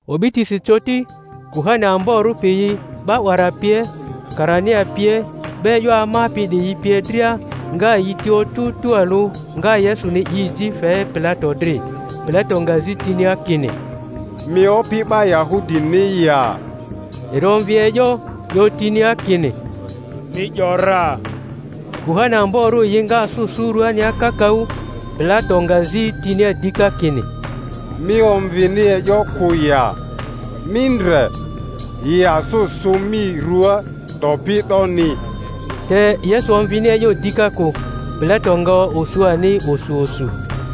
O'bitisi coti, kuhani amborᴜ piyi 'ba 'wara pie, karania pie, 'ba e'yo amapi 'diyi pie dria nga yi ti otᴜ tualᴜ, nga Yesuni 'i ji fe Pilato dri. Pilato nga zi tinia kini, Mi Opi 'ba Yahudini ya? Eri omvi e'yo, 'yo tinia kini, Mi 'yo ra. Kuhani amborᴜ yi nga asᴜ sᴜ ruania kakaᴜ. Pilato nga zi tinia dika kini, Mi omvini e'yo kᴜ ya? Mi ndre, yi asᴜ sᴜ mi ruaa 'dopi 'doni. Te Yesu omvini e'yo dika kᴜ; Pilato nga osu ani osu osu.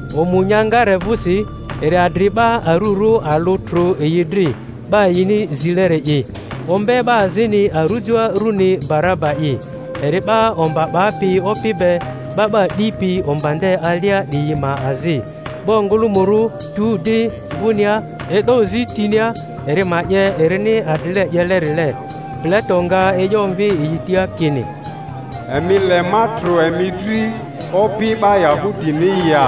Omu nya ngare vᴜsi eri adri 'ba arᴜrᴜ alᴜ trᴜ yi dri, 'ba yini zileri'i. Ombe 'ba azini arujoa, runi Baraba'i, eri 'ba omba 'bapi opi be, 'ba 'ba 'dipi omba nde alia 'diyi ma azi. 'Ba ongᴜlᴜmᴜrᴜ tu di vᴜnia, e'do zi tinia eri ma 'ye erini adrile 'yelerile. Pilato nga e'yo omvi yi tia kini, Emi le ma trᴜ emi dri Opi 'ba Yahudini ya?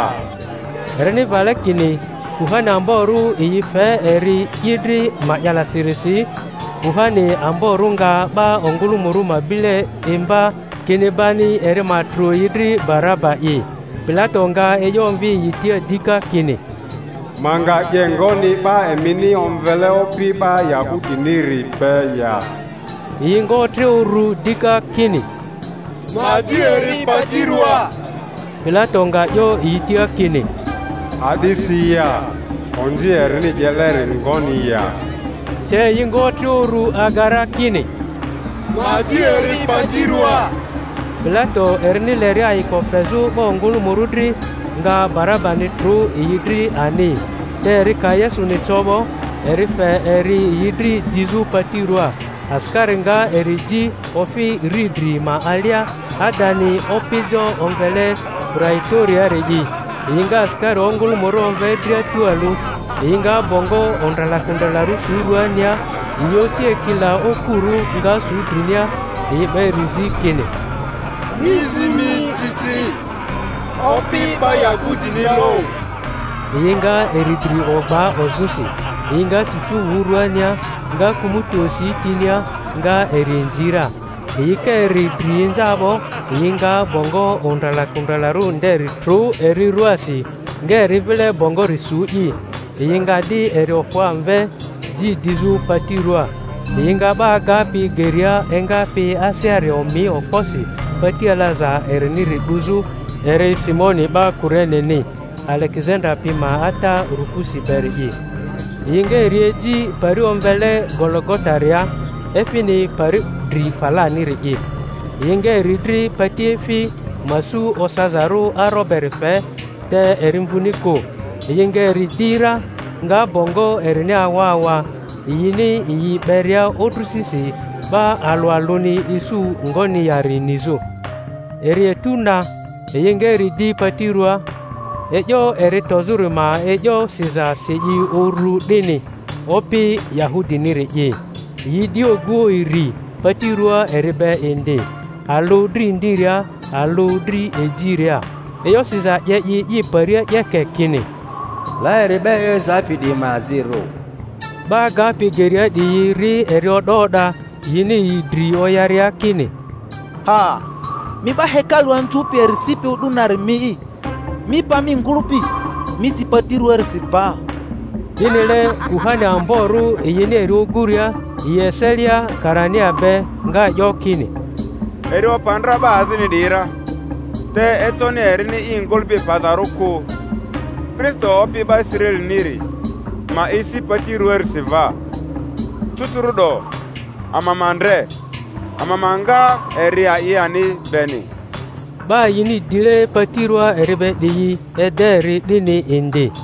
Erini vale kini kuhani amborᴜ yi fe eri i dri ma'yalasirisi. Kunani amborᴜ nga 'ba ongᴜlᴜmᴜrᴜ ma bile imba, kini bani eri ma trᴜ yi dri Barabani'i. Pilato nga e'yo omvi yi tia dika kini, Ma nga 'ye ngoni 'ba emini omvele Opi 'ba Yanudiniri be ya? Yi nga otre uru dika kini, Ma di eri pati ruaa! Pilato nga 'yo yi tia kini, A'disi ya? Onzi erini 'yeleri ngoni ya? Te yi nga otre uru aga ra, kini ma di eri pati ruaa. Pilato, erini leria ayiko fezᴜ 'ba ongᴜlᴜmᴜrᴜ dri, nga Barabani trᴜ yi dri ani; te eri ka Yesuni co 'bo, eri fe eri yi dri dizᴜ pati ruaa. Asikari nga eri ji ofi riidri ma alia, adani opijo omvele Praito-riori'i; yi nga asikari ongᴜlᴜmᴜrᴜ omve dria tualᴜ. Yi nga bongo ondralakondralarᴜ su ruania, yi oci ekila okurᴜ, nga sᴜ drinia. Yi 'ba eri zi, kini, Mi zi mi ci ci, Opi 'ba Yahudini loᴜ! Yi nga eri dri ogba ozᴜsi, yi nga cucu wᴜ rᴜania, nga kᴜmᴜti osi tinia, nga eri inzi ra. Yi ka eri dri inza 'bo, yi nga bongo ondralakondralarᴜ nderi trᴜ eri ruaasi, nga eri vile bongori su'i. Yi nga di eri ofᴜ amve, ji dizᴜ pati ruaa. Yi nga 'ba agapi geria engapi aseari omi okposi pati alaza eriniri 'duzᴜ; eri Simoni 'ba Kureneni, Alegezanda pi ma ata Rufusi beri'i. Yi nga eri eji pari omvele Gologotaria (efini pari dri falaniri'i). Yi nga eri dri patiefi ma su osazarᴜ aro beri fe, te eri mvuni kᴜ. Yi nga eri di ra, nga bongo erini awa awa, yini yi 'beria odrisisi, 'ba alᴜ alᴜni isu ngoni yari nizᴜ. Eri etu na, yi nga eri di pati ruaa. E'yo eri tozᴜri ma e'yo siza si i uru 'dini, OPI YAHUDINIRI'I. Yi di oguo iri pati ruaa eri be indi, alᴜ dri ndiria, alᴜ dri ejiria. E'yo siza 'ye i i paria 'yeke, kini, La eri 'ba e'yo ezapi 'diyi ma azirᴜ. 'Ba agapi geria 'diyi ri eri o'da o'da, yini yi dri oyaria, kini, Ha! Mi 'ba hekalu anzᴜpi eri sipi o'du nari mi'i, mi pa mi ngᴜlᴜpi, mi si pati ruaarisi va! 'Dinile kuhani amborᴜ, yini eri oguria yi eselia karania be, nga 'yo kini, Eri opa ndra 'ba azini 'diyi ra, te econi erini i ngᴜlᴜpi pazarᴜ kᴜ. Kristo Opi 'ba Israeliniri ma esi pati ruaarisi va cucuru'do, ama ma ndre, ama ma nga eri a'i ani beni! 'Ba yini dile pati ruaa eri be 'diyi ede eri 'dini indi.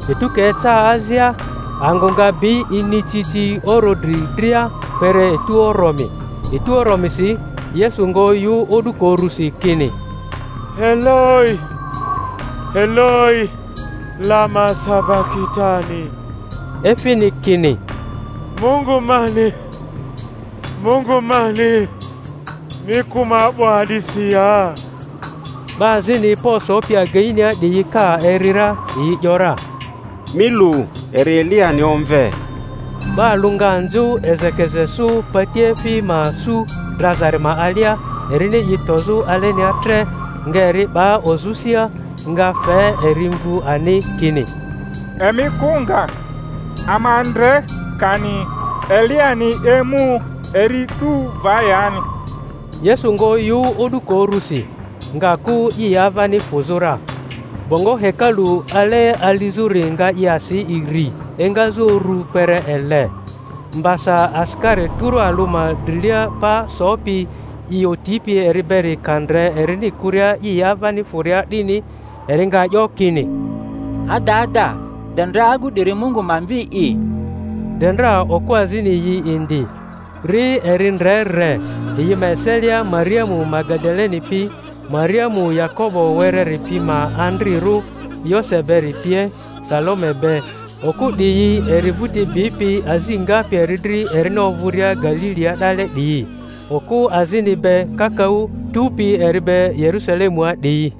Etu ka eca azia, angᴜ nga bi inicici oro dri dria kpere etu oromi. Etu oromisi Yesu nga oyᴜ o'duko urusi, kini, Eloi, Eloi, lama sabakitani? efini kini, Mungu mani, Mungu mani, mi kᴜ ma 'bo a'disi ya? 'Ba azini pa osopi ageinia 'diyi ka eri ra, yi ‘yora, Mi lu, eri Eliyani omve. 'Ba alᴜ nga nzᴜ ezekeze sᴜ patiefi ma su drazari ma alia, erini i tozᴜ alenia tre, nga eri 'ba ozᴜ sia, nga fe eri mvu ani, kini, Emi kᴜ nga, ama ndre kani Eliyani emu eri 'du va yani. Yesu nga oyᴜ o'duko urusi, nga kᴜ i avani fᴜzᴜ ra. Bongo hekalu ale alizᴜri nga i asi iri, engazᴜ uru kpere ele. Mbasa asikari tᴜrᴜ alᴜ ma drilia pa sopi i otipi eri beri ka ndre erini kᴜria i avani fᴜria 'dini, eri nga 'yo kini, Adada de ndra agu 'diri Mungu ma Mvi'i! De ndra okᴜ azini yi indi, ri eri ndre re; yi ma eselia Mariamu Magadaleni pi, Mariamu Yakobo wereri pi ma andrirᴜ Yose beri pie, Salome be; okᴜ 'diyi eri vᴜti bipi azi ngapi eri dri erini ovᴜria Galilia 'dale 'diyi; okᴜ azini be kakaᴜ tupi eri be Yerusalemua 'diyi.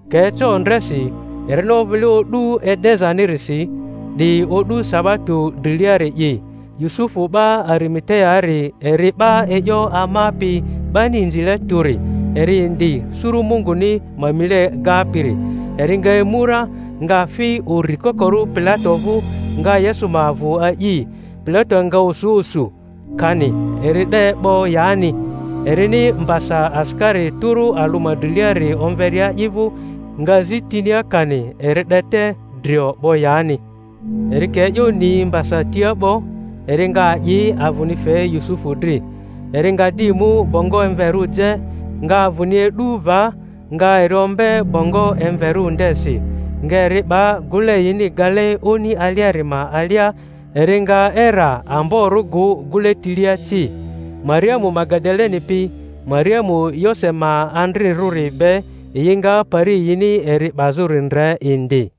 Ka eca ondresi, erini ovᴜle o'du Edezanirisi, 'di o'du sabato driliari'i, Yusufu 'ba Arimateaari, eri 'ba e'yo amapi 'bani inzile tᴜri, eri indi suru Munguni ma mile gapiri, eri nga emu ra, nga fi uri kokorᴜ Pilato vᴜ, nga Yesu ma avᴜ a'i. Pilato nga osu osu kani eri 'de 'bo yani; erini mbasa asikari tᴜrᴜ alᴜ ma driliari omveria i vᴜ, nga zi tinia kani eri 'de te drio 'bo yani. Eri ka e'yo ni mbasa tia 'bo, eri nga a'i avᴜni fe Yusufu dri. Eri nga di mu bongo emverᴜ je, nga avᴜni e'du va, nga eri ombe bongo emverᴜ ndesi, nga eri 'ba gᴜle yini gale oni aliari ma alia; eri nga era amborᴜ gᴜ gᴜle tilia ci. Mariamu Magadaleni pi Mariamu Yose ma andrirᴜri be yi nga pari yini eri 'bazᴜri ndre indi.